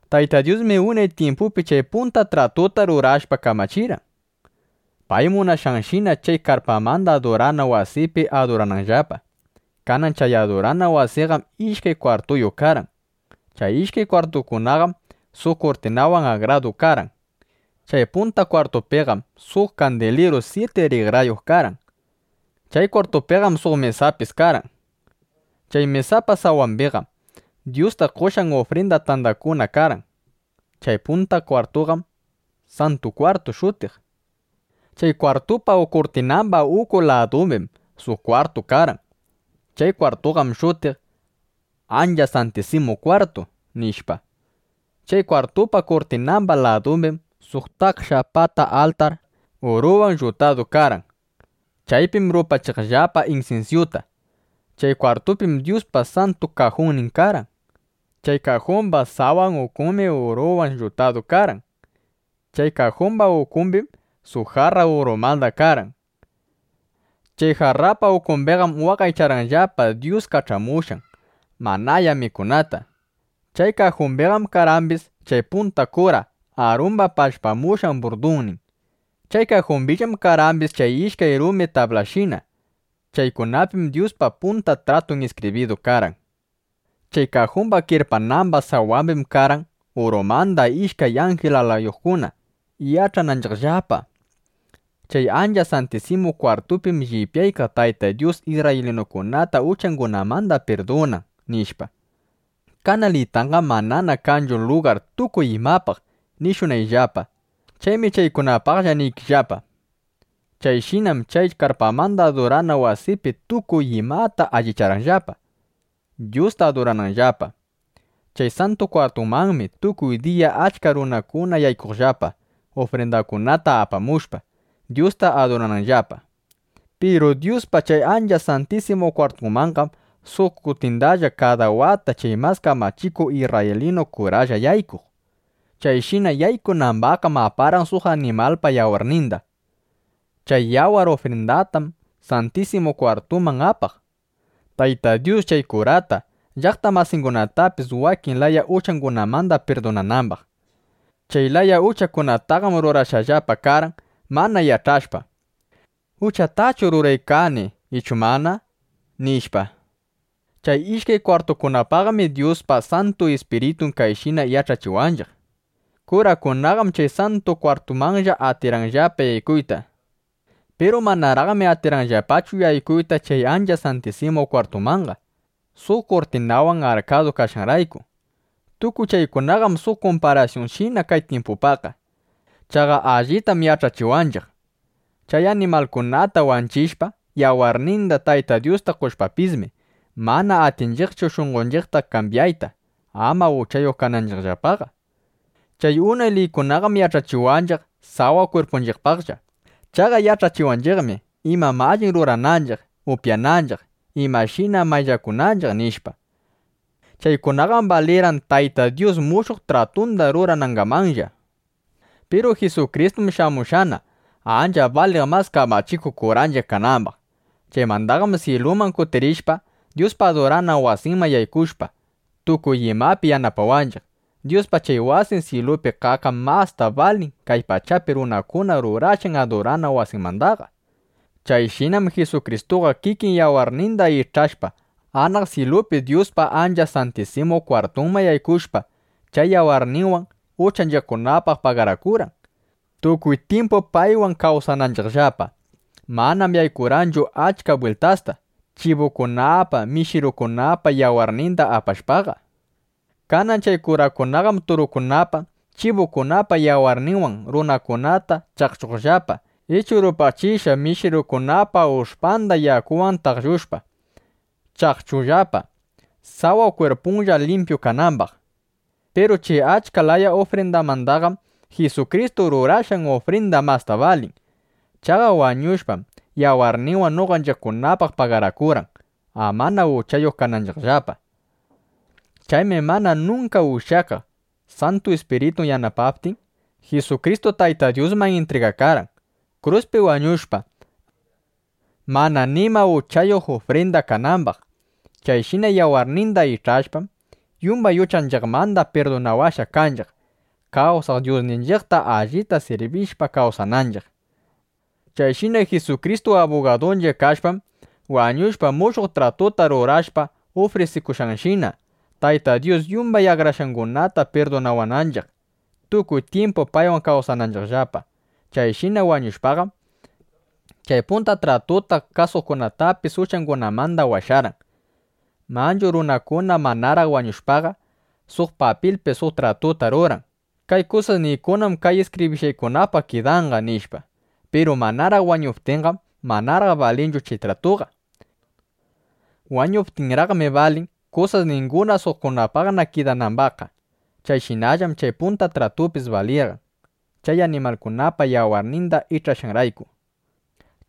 Tayta Dyusmi unay tyimpupi chay punta tratuta rurashpa kamachirqan, pay munashqanshina chay karpamanda adurana wasipi adurananllapa. Kanan chay adurana wasinqam ishkay kwartuyuq karqan. Chay ishkay kwartukunaqam suq kurtinawan akradu karqan. Chay punta kwartupiqam suq kandiliru syiti rikrayuq karqan. Chay kwartupiqam suq mesapis karqan. Chay mesapa sawambiqam Dyusta qoshqan ufrinda tandakuna karqan. Chay punta kwartuqam “Santu Kwartu” shutiq. Chay kwartupa kurtinamba uku ladumbim suq kwartu karqan. Chay kwartuqam shutiq: “Ancha Santisimu Kwartu”, nishpa. Chay kwartupa kurtinamba ladumbim suq taksha pata altar uruwan llutadu karqan. Chaypim rupachiqllapa insinsyuta. Chay kwartupim Dyuspa Santu Kajunnin karqan. Chay kajumba sawan ukunmi uruwan llutadu karqan. Chay kajumba ukumbim suq jarra urumanda karqan. Chay jarrapa ukumbiqam waqaycharqanllapa Dyus kach'amushqan manaya mikunata. Chay kajumbiqam karqambis chay punta kura Arumba pallpamushqa burdunnin. Chay kajumbillam karqambis chay ishkay rumi tablashina. Chaykunapim Dyuspa Punta Tratun iskibridu karqan. Chay kajumba kirpanamba sawambim karqan urumanda ishkay anjil alayuqkuna, yach'ananchiqllapa: Chay Ancha Santisimu Kwartupim llipyaykaq Tayta Dyus isrraylinukunata uchangunamanda pirdunan, nishpa. Kanalitanqam manana kanchu lugar tukuy imapaq nishunayllapa. Chaymi chaykunapaqlla niykillapa. Chayshinam chay karpamanda adurana wasipi tukuy imata allicharqanllapa, Dyusta adurananllapa. Chay Santu Kwartumanmi tukuy diya achka kurakuna yaykuqllapa, ufrindakunata apamushpa, Dyusta adurananllapa. Piru Dyuspa chay Ancha Santisimu Kwartunmanqam suq kutindalla kada wata chay mas kamachikuq isrraylinu kuralla yaykuq. Chayshina yaykunambaqqam aparqan suq animalpa yawarninda. Chay yawar ufrindatam Santisimu Kwartuman apaq, Tayta Dyus chay kurata, llaqta masingunatapis wakin laya uchangunamanda pirdunanambaq. Chay laya uchakunataqam rurashqallapa karqan, mana yach'ashpa: ¿Uchatachu ruraykani ichu mana? nishpa. Chay ishkay kwartukunapaqmi Dyuspa Santu Ispiritun kayshina yach'achiwanchiq: Kurakunaqam chay Santu Kwartumanlla atirqanllapa yaykuyta, nishpa. Piru manaraqmi atirqanllapachu yaykuyta chay Ancha Santisimu Kwartumanqa, suq kurtinawan arkadu kashqanrayku. Tukuy chaykunaqam suq kumparasyunshina kay tyimpupaqqa. Chaqa allitam yach'achiwanchiq: Chay animalkunata wanchishpa, yawarninda Tayta Dyusta qoshpapismi, mana atinchiqchu shunqonchiqta kambyayta, ama uchayuq kananchiqllapaqa. Chay unay liykunaqam yach'achiwanchiq sawa kwirpunchiqpaqlla. Chaqa yach'achiwanchiqmi: Imam alli mikunanchiq, upyananchiq, imashina mayllakunanchiq, nishpa. Chaykunaqam balirqan Tayta Dyus mushuq tratunda ruranangamanlla. Piru Jisukristum shamushqana, ancha baliq mas kamachikuq kuranchiq kanambaq. Chaymandaqam syiluman kutirishpa, Dyuspa adurana wasinman yaykushpa, tukuy imapi yanapawanchiq. Dyuspa chay wasin syilupi kaqqam masta balin kay pachapi runakuna rurashqan adurana wasimandaqa. Chayshinam Jisukristuqa kikin yawarninda ich'ashpa, anaq syilupi Dyuspa Ancha Santisimu Kwartunman yaykushpa, chay yawarninwan uchanchiqkunapaq pagarakurqan, tukuy tyimpu paywan kawsananchiqllapa. Manam yaykurqanchu achka bwiltasta, chibukunapa, mishirukunapa yawarninda apashpaqa. Kanan chay kurakunaqam turukunapa, chibukunapa yawarninwan runakunata chaqchunllapa ichu rupachishqa mishirukunapa ush'panda yakuwan taqllushpa, chaqchunllapa, sawa kwirpunlla limpyu kanambaq. Piru chay achka laya ufrindamandaqam Jisukristu rurashqan ufrinda masta balin. Chaqa wañushpam, yawarninwan noqanchiqkunapaq pagarakurqan, amana uchayuq kananchiqllapa. Chaymi mana nunka ushyakaq Santu Ispiritu yanapaptin, Jisukristu Tayta Dyusman intrigakarqan, kruspi wañushpa, mana nima uchayuq ufrinda kanambaq. Chayshina yawarninda ich'ashpam, yumbay uchanchiqmanda pirdunawashqa kanchiq, kawsaq Dyusninchiqta allita sirbishpa kawsananchiq. Chayshina Jisukristu abugadunchiq kashpam, wañushpa, mushuq tratuta rurashqa ufrisikushqanshina, Tayta Dyus yumbay akrashqangunata pirdunawananchiq, tukuy tyimpu paywan kawsananchiqllapa. Chayshina wañushpaqam, chay punta tratuta kasuqkunatapis uchangunamanda washarqan. Manchu runakuna manaraq wañushpaqa, suq papilpi suq tratuta ruran: “Kay kusasniykunam kay iskibrishqaykunapaq kidanqa”, nishpa. Piru manaraq wañuptinqam, manaraq balinchu chay tratuqa. Wañuptinraqmi balin, kusasninguna suqkunapaqna kidanambaqqa. Chayshinallam chay punta tratupis balirqan, chay animalkunapa yawarninda ich'ashqanrayku.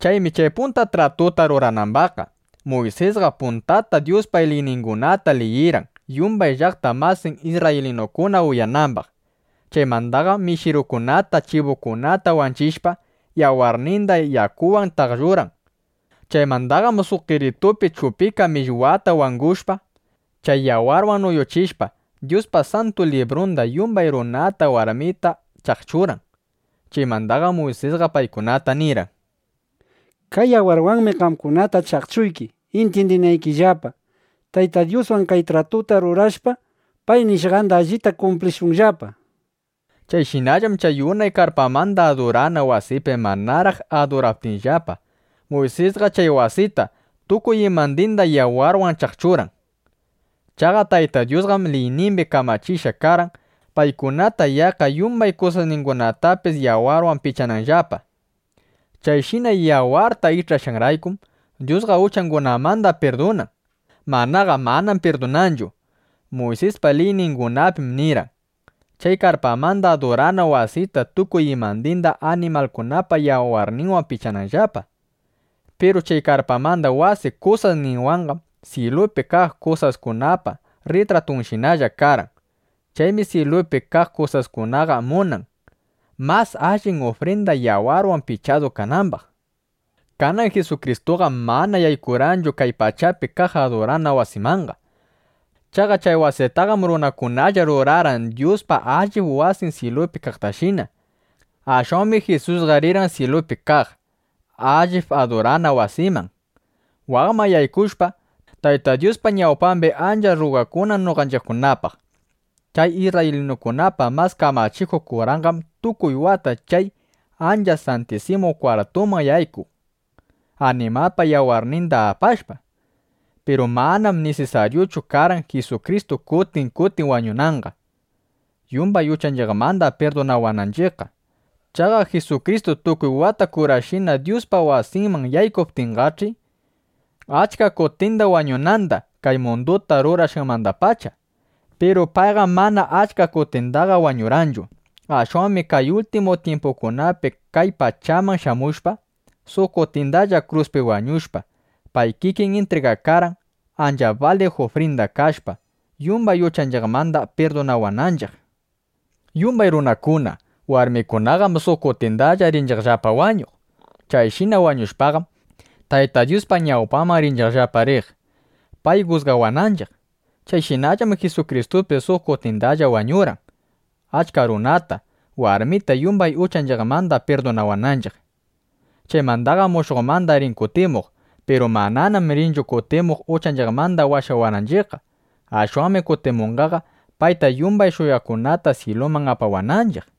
Chaymi chay punta tratuta ruranambaqqa, Muysisqa puntata Dyuspa liyningunata liyirqan yumbay llaqta masin isrraylinukuna uyanambaq. Chaymandaqam mishirukunata chibukunata wanchishpa, yawarninda yakuwan taqllurqan. Chaymandaqam suq qeritupi chupika millwata wangushpa, chay yawarwan nuyuchishpa, Dyuspa Santu Librunda, yumbay runata warmita chaqchurqan. Chaymandaqam Muysisqa paykunata nirqan: “Kay yawarwanmi qamkunata chaqchuyki, intyindinaykillapa: Tayta Dyuswan kay tratuta rurashpa, pay nishqanda allita kumplishunllapa”, nishpa. Chayshinallam chay unay karpamanda adurana wasipi manaraq aduraptinllapa, Muysisqa chay wasita, tukuy imandinda yawarwan chaqchurqan. Chaqa Tayta Dyusqam liynimbi kamachishqa karqan, paykunata yaqqa yumbay kusasningunatapis yawarwan pichananllapa. Chayshina yawarta ich'ashqanraykum, Dyusqa uchangunamanda pirdunan; manaqa manam pirdunanchu. Muysispa liyningunapim nirqan, chay karpamanda adurana wasita tukuy imandinda animalkunapa yawarninwan pichananllapa. Piru chay karpamanda wasi kusasninwanqam syilupi kaq kusaskunapa rritratunshinalla karqan. Chaymi syilupi kaq kusaskunaqa munan, mas allin ufrinda yawarwan pichadu kanambaq. Kanan Jisukristuqam mana yaykurqanchu kay pachapi kaq adurana wasimanqa. Chaqa chay wasitaqam runakunalla rurarqan Dyuspa allip wasin syilupi kaqtashina. Ashwanmi Jisusqa rirqan syilupi kaq allip adurana wasiman, waqman yaykushpa, Tayta Dyuspa ñawpambi ancha rrugakunan noqanchiqkunapaq. Chay isrraylinukunapa mas kamachikuq kuranqam tukuy wata chay Ancha Santisimu Kwartuman yaykun, animalpa yawarninda apashpa. Piru manam nisisaryuchu karqan Jisukristu kutin kutin wañunanqa, yumbay uchanchiqmanda pirdunawananchiqqa. Chaqa Jisukristu tukuy wata kurashina Dyuspa wasinman yaykuykaptinqach'i, achka kutinda wañunanda kay munduta rurashqanmandapacha. Piru payqam mana achka kutindaqa wañurqanchu. Ashwanmi kay ultimu tyimpukunapi kay pachaman shamushpa, suq kutindalla kruspi wañushpa, pay kikin intrigakarqan, ancha baliq ufrinda kashpa, yumbay uchanchiqmanda pirdunawananchiq. Yumbay runakuna, warmikunaqam suq kutindalla rinchiqllapa wañuq. Chayshina wañushpaqam, Tayta Dyuspa ñawpanman rinchiqllapa riq, pay jusgawananchiq. Chayshinallam Jisukristupis suq kutindalla wañurqan, achka runata, warmita yumbay uchanchiqmanda pirdunawananchiq. Chaymandaqam mushuqmanda rin kutimuq. Piru mananam rinchu kutimuq uchanchiqmanda washawananchiqqa. Ashwanmi kutimunqaqa, payta yumbay shuyaqkunata syiluman apawananchiq.